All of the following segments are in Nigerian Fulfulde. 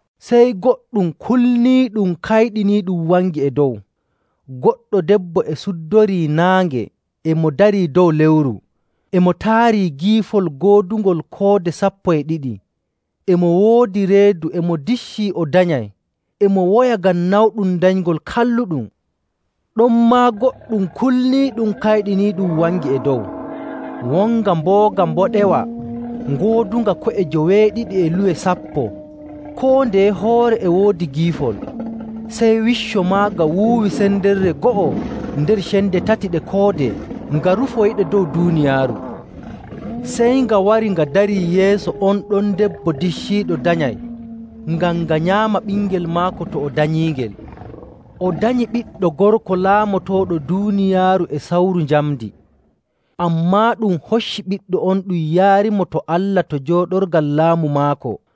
Sey goɗɗum kulniiɗum kayɗiniiɗum wangi e dow. Goɗɗo debbo e suddorii naange e mo darii dow lewru. E mo taari giifol goodungol koode sappo e ɗiɗi. E mo woodi reedu e mo diccii o danyay, e mo woya ngam nawɗum danyngol kalluɗum. Ɗonmaa goɗɗum kulniiɗum kayɗiniiɗum wangi e dow: wonga mbooga mboɗewa ngoodunga ko'e joweeɗiɗi e luwe sappo, koo ndeye hoore e woodi giifol. Sey wicco maaga wuuwi sendere go'o nder cende tati ɗe koode nga rufoyiɗe dow duuniyaaru. Sey nga wari nga darii yeeso on ɗon debbo dicciiɗo danyay ngam nga nyaama ɓingel maako to o danyiingel. O danyi ɓiɗɗo gorko laamotooɗo duuniyaaru e sawru njamndi. Ammaa ɗum hocci ɓiɗɗo on ɗum yaarimo to Allah to jooɗorgal laamu maako.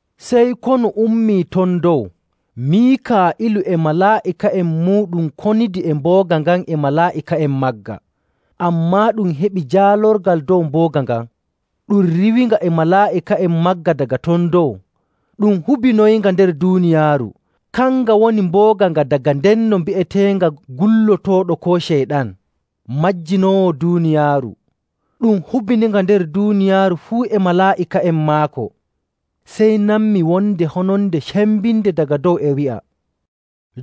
Sey konu ummii ton dow. Miikaa'ilu e malaa'ika'en muuɗum konidi e mbooga ngan e malaa'ika'en magga. Ammaa ɗum heɓi jaalorgal dow mbooga ngan, ɗum riiwinga e malaa'ika'en maaga daga ton dow. Ɗum hubinoyinga nder duuniyaaru. Kanga woni mbooga nga daga ndenno bi'eteenga Gullotooɗo koo Ceyɗan, majjinoowo duuniyaaru. Ɗum hubininga nder duuniyaaru fuu e malaa'ika'en maako. Sey nanmi wonde hononde cembinde daga dow e wi'a,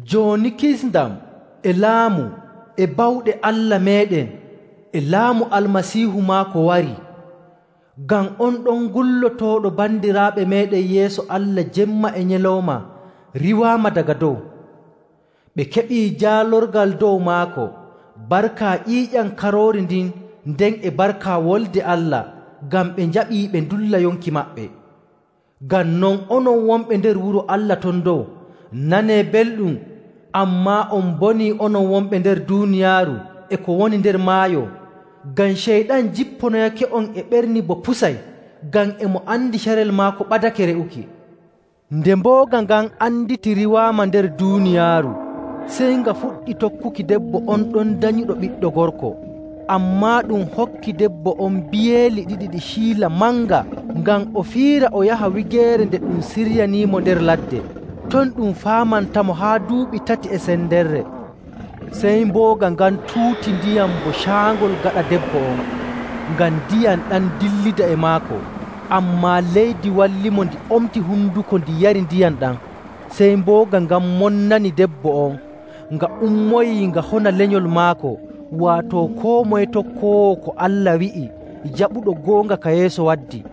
“Jooni kisndam, e laamu, e bawɗe Allah meeɗen, e laamu Almasiihu maako warii. Ngam on ɗon gullotooɗo bandiraaɓe meeɗen yeeso Allah jemma e nyalawma riiwaama daga dow. Ɓe keɓii jaalorgal dow maako barka ƴiiƴam Karoori ndin nden e barka Wolde Allah ngam ɓe njaɓii ɓe ndulla yonki maɓɓe. Ngam non, onon wonɓe nder wuro Allah ton dow, nanee belɗum! Ammaa on mbonii onon wonɓe nder duuniyaaru e ko woni nder maayo! Ngam Ceyɗan jipponoyake'on e ɓerni bo pusay ngam e mo andi carel maako ɓadake re'uki.” Nde mbooga ngan anditi riiwaama nder duuniyaaru, sey nga fuɗɗi tokkuki debbo on ɗon danyuɗo ɓiɗɗo gorko. Ammaa ɗum hokki debbo on biyeeli ɗiɗi ɗi ciila manga ngam o fiira o yaha wigeere nde ɗum siryaniimo nder ladde. Ton ɗum faamantamo haa duuɓi tati e sendere. Sey mbooga ngan tuuti ndiyam bo caangol gaɗa debbo on, ngam ndiyam ɗam dillida e maako. Ammaa leydi wallimo ndi omti honduko ndi yardi ndiyam ɗam. Sey mbooga ngan monnani debbo on, nga ummoyii nga hona lenyol maako, waato koo moye tokkoowo ko Allah wi'i jaɓuɗo goonga ka Yeesu waddi.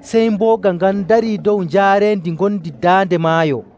Sey mbooga ngan darii dow njaareendi ngondi daande maayo.